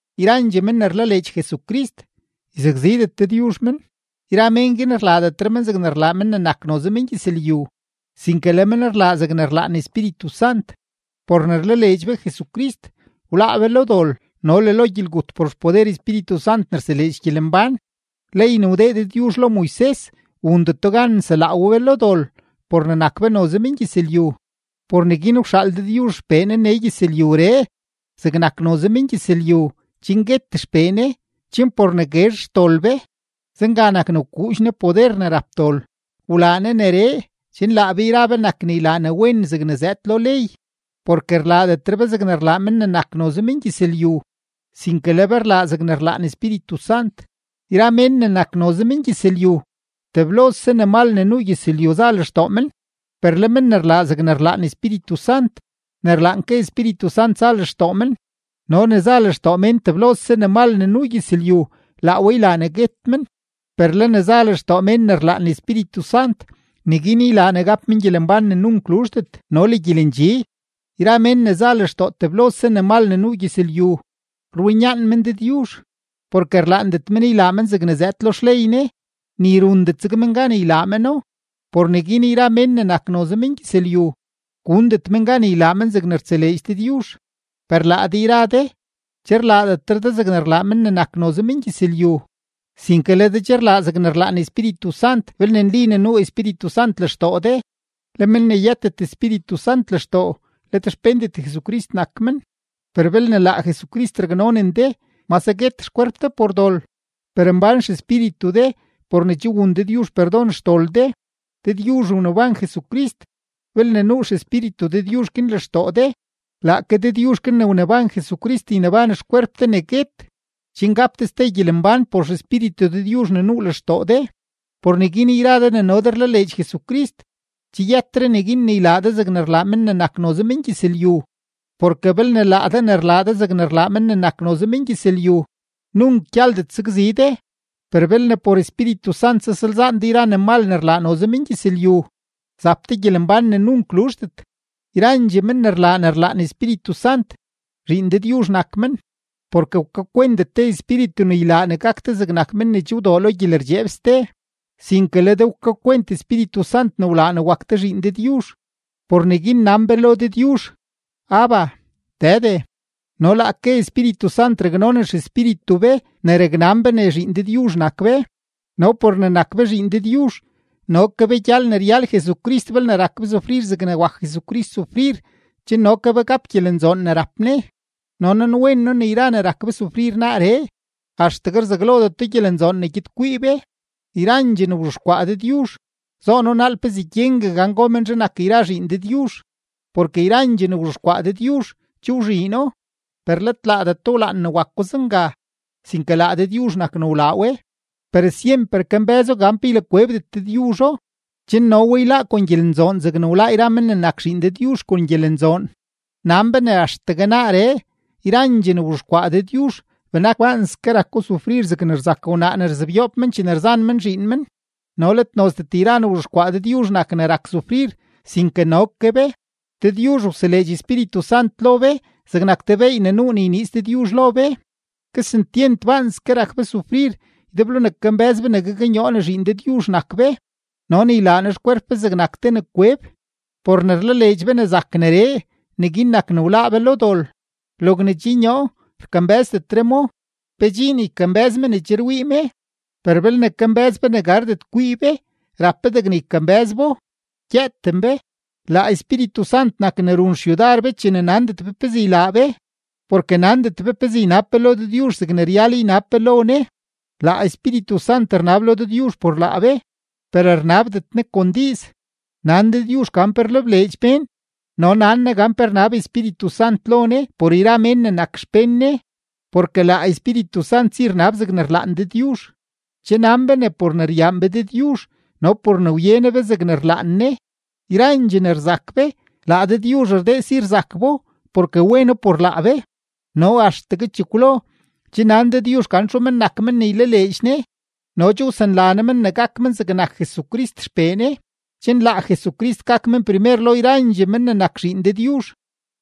Yrandxee men ne rlaleedx Jesucrist, yzakzidet Dëdyuzh men, yra men guin rlaadetre men zegne rlaa men ne nak noze mengyëzlyu, sinke le men rlaa zegne rlaan Espíritu Sant. Por ne rlaleedx be Jesucrist, wláá be lo dol no le lo gyelgut por xpoder Espíritu Sant ne rseleedx gyelembán. Ley ne wdee Dëdyuzh lo Moises wundeto gan nselaa we be lo dol por ne nak be noze mengyëzlyu. Por neguin wxaal Dëdyuzh XPee Ne nee gyëzlyuree zegnak noze mengyëzlyu chen guet XPee Ne chen por ne guezh xdol be, zenga nak ne wkuudx Ne poder ne rap dol. Wlaa Ne neree, chen laa be yra be nak ne ylaa ne wen zegne zëëd lo ley, porke rlaadetre be zegne rlaa men ne nak noze mengyëzlyu, sinke le be rlaa zegne rlaan Espíritu Sant. Yra mén ne nak noze mengyëzlyu, teblose ne mal ne nuu gyëzlyu za lextoo men; per le men ne rlaa zegne rlaan Espíritu Sant, ne rlaan ke Espíritu Sant za lextoo men. No ne za lextoo mén teblose ne mal ne nuu gyëzlyu, laa we ylaa ne guet men; per le ne za lextoo mén ne rlaan Espíritu Sant, neguin ylaa ne gap men gyelembán ne nunk luzhdet no le gyelendxi. Yra mén ne za lextoo teblose ne mal ne nuu gyëzlyu, rwinyaan men Dëdyuzh, porke rlaandet men ylaa men zegne zëëd lo xley Ne, ni rundet zeg men gan ylaa meno. Por neguin yra mén ne nak noze mengyëzlyu, gundet men gan ylaa men zegne rtseleedx Dëdyuzh. Per laa de yra de, che rlaadetre de zegne rlaa men ne nak noze mengyëzlyu, sinke le de che rlaa zegne rlaan Espíritu Sant belne nli ne nuu Espíritu Sant lextoo de; le men ne yëtet Espíritu Sant lextoo, let xpéndet Jesucrist nak men. Per belne laa Jesucrist raknonen de, mase guet xkwerp de por dol, per mbán xespíritu de por ne che wun Dëdyuzh perdon xdol de. Dëdyuzh wneban Jesucrist; belne nuu XEspíritu Dëdyuzh guin lextoo de, laake Dëdyuzh guin ne wneban Jesucrist yneban xkwerp de ne guet, chen gap de ste gyelembán por XEspíritu Dëdyuzh ne nuu lextoo de. Por neguin, yra de ne no de rlaleedx Jesucrist, che yëtre neguin ne ylaa de zegne rlaa men ne nak noze mengyëzlyu. Porke belne laa de ne rlaa de zegne rlaa men ne nak noze mengyëzlyu, nunk gyaldet sakzi de; per belne por Espíritu Sant zasalzaan de yra ne mal ne rlaa noze mengyëzlyu, zap de gyelembán ne nunk luzhdet. Yrandxee men ne rlaa ne rlaan Espíritu Sant, zhiin Dëdyuzh nak men. Porke wkakwentet de espíritu ne ylaa ne gak de zegnak mén ne che wdoo lo gyelerdxeeb ste, sinke le de wkakwent Espíritu Sant ne wlaa ne wak de zhiin Dëdyuzh; por neguin nan be lo Dëdyuzh: “¡Abba, Dëde!” No laake Espíritu Sant raknonen xespíritu be ne raknan be ne zhiin Dëdyuzh nak be. No por ne nak be zhiin Dëdyuzh, no ke be gyal ne ryal Jesucrist belne rak be sufrir zegne wak Jesucrist sufrir chen no ke be gap gyelenzoon ne rap Ne. No nanwen noo ne yra ne rak be sufrir naaree, axtegue rzaglodeto gyelenzoon ne gyed kwii be. Yrandxee ne wzhexkwaa Dëdyuzh, zoono naal pezee gyengue gan go menzhe nak yra zhiin Dëdyuzh. Porke yrandxee ne wzhexkwaa Dëdyuzh, che wzhiino, per let laadeto wlaan ne wako zenga, sinke laa Dëdyuzh nak ne wlaa we, per syemper kambë́zo gan pe ylakwebdet Dëdyuzho, chen no we yláá kon gyelenzoon zegne wláá yra men ne nak zhiin Dëdyuzh kon gyelenzoon. Nan be ne axtegue naaree, yrandxee ne wzhexkwaa Dëdyuzh benak baanske rako sufrir zegne rzak wnaa ne rzebyoob men chene rzan men zhiin men. No let nozdet yra ne wzhexkwaa Dëdyuzh nak ne rak sufrir, sinke no ke be. Dëdyuzh wseleedx Espíritu Sant lo be zegnak te beey ne nuu ne yniiz Dëdyuzh lo be. Kesentyent baanske rak be sufrir ydeblo ne kambë́z be ne gaknyoo ne zhiin Dëdyuzh nak be no ne ylaa Ne xkwerp be zegnak te ne kweb. Por ne rlaleedx be ne zak neree, neguin nak ne wláá be lo dol. Logne che nyoo, rkambë́zdetre mo. ¿Pe dxiin ykambë́z me ne che rwii me? Per belne kambë́z be ne gardet kwii be, rap be degne ykambë́z bo, gyëëten be. Laa Espíritu Sant nak ne run xyudar be chene nandet be pezee ylaa be; porke nandet be pezee ynab be lo Dëdyuzh zegne ryal ynab be lo Ne, laa Espíritu Sant rnab lo Dëdyuzh por laa be, per rnabdet Ne kon diiz. Nan Dëdyuzh gan pe rlebleedx mén no nan Ne gan pe rnab Espíritu Sant lo Ne por yra mén ne nak xpén Ne, porke laa Espíritu Sant si rnab zegne rlaan Dëdyuzh. Che nan be ne por ne ryaan be Dëdyuzh no por ne wye Ne be zegne rlaan Ne, yrandxee ne rzak be, laa Dëdyuzh rdee si rzak bo porke weno por laa be. No axtegue chekwlo, che nan Dëdyuzh gan txu men nak men ne ylaleedx Ne no che wsanla Ne men ne gak men zegnak Jesucrist XPee Ne, chen laa Jesucrist gak men primer lo yrandxee men ne nak zhiin Dëdyuzh.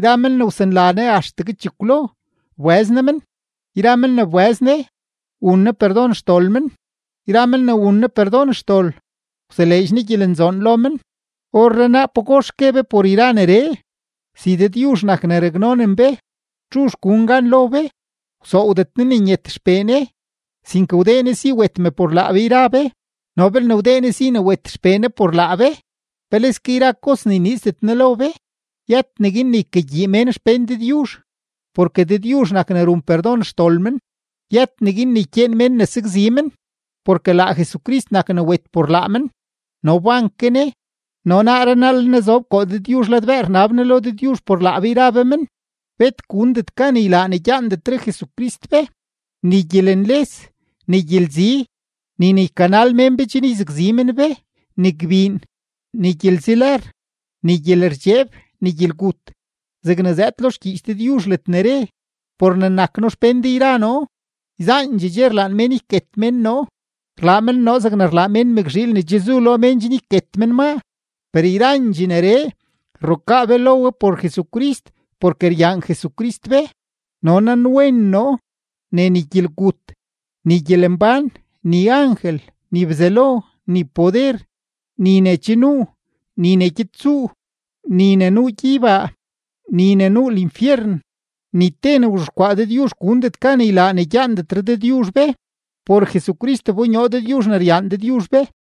Yra men ne wsanla Ne axtegue chekwlo, wbëz Ne men; yra men ne wbëz Ne, wun Ne perdon xdol men; yra men ne wun Ne perdon xdol, wseleedx Ne gyelenzoon lo men. ¿Orrenaa pagox gue be por yra neree? Si Dëdyuzh nak ne raknonen be, ¿txuzh gun gan lo be? Wsoowdet Ne ne nyet XPee Ne, sinke wdee Ne si wet mee por laa be yra be; no belne wdee Ne si wet XPee Ne por laa be, ¡peleske yra kos yniizdet Ne lo be! Yët neguin ne ykagyii mén xpén Dëdyuzh, porke Dëdyuzh nak ne run perdon xdol men. Yët neguin ne ykyeen mén ne sakzi men, porke laa Jesucrist nak ne wet por laa men no wban ke Ne, no naaree naa le Ne zob koo Dëdyuzh ladbëë rnab Ne lo Dëdyuzh por laa be yra be men. Bet gundet gan ylaa ne gyaandetre Jesucrist be: ni gyelenles, ni gyelzi, ni ne ykanal mén be chen yzakzi men be, ni gbiin, ni gyelzi lër, ni gyelerdxeeb, ni gyelgut. Zegne zëëd lo xgyiich Dëdyuzh ledne re: Por ne nak noo xpén de yra noo, yzaandxee dxe rlaan mén yket mén noo, rlaa men noo zeg rlaa mén mëkzhiil ne che zu lo mén chen yket men maa. Per yrandxee neree, rrukaa be lo we por Jesucrist porke ryaan Jesucrist be. Noo nanwen noo ne ni gyelgut, ni gyelembán, ni angel, ni Bzelo, ni poder, ni ne che nuu, ni ne gyed tsuu, ni ne nuu gyeybaa, ni ne nuu linfyeren, ni te ne wzhexkwaa Dëdyuzh gundet gan ylaa ne gyaandetre Dëdyuzh be; por Jesucrist wbonyoo Dëdyuzh ne ryaan Dëdyuzh be.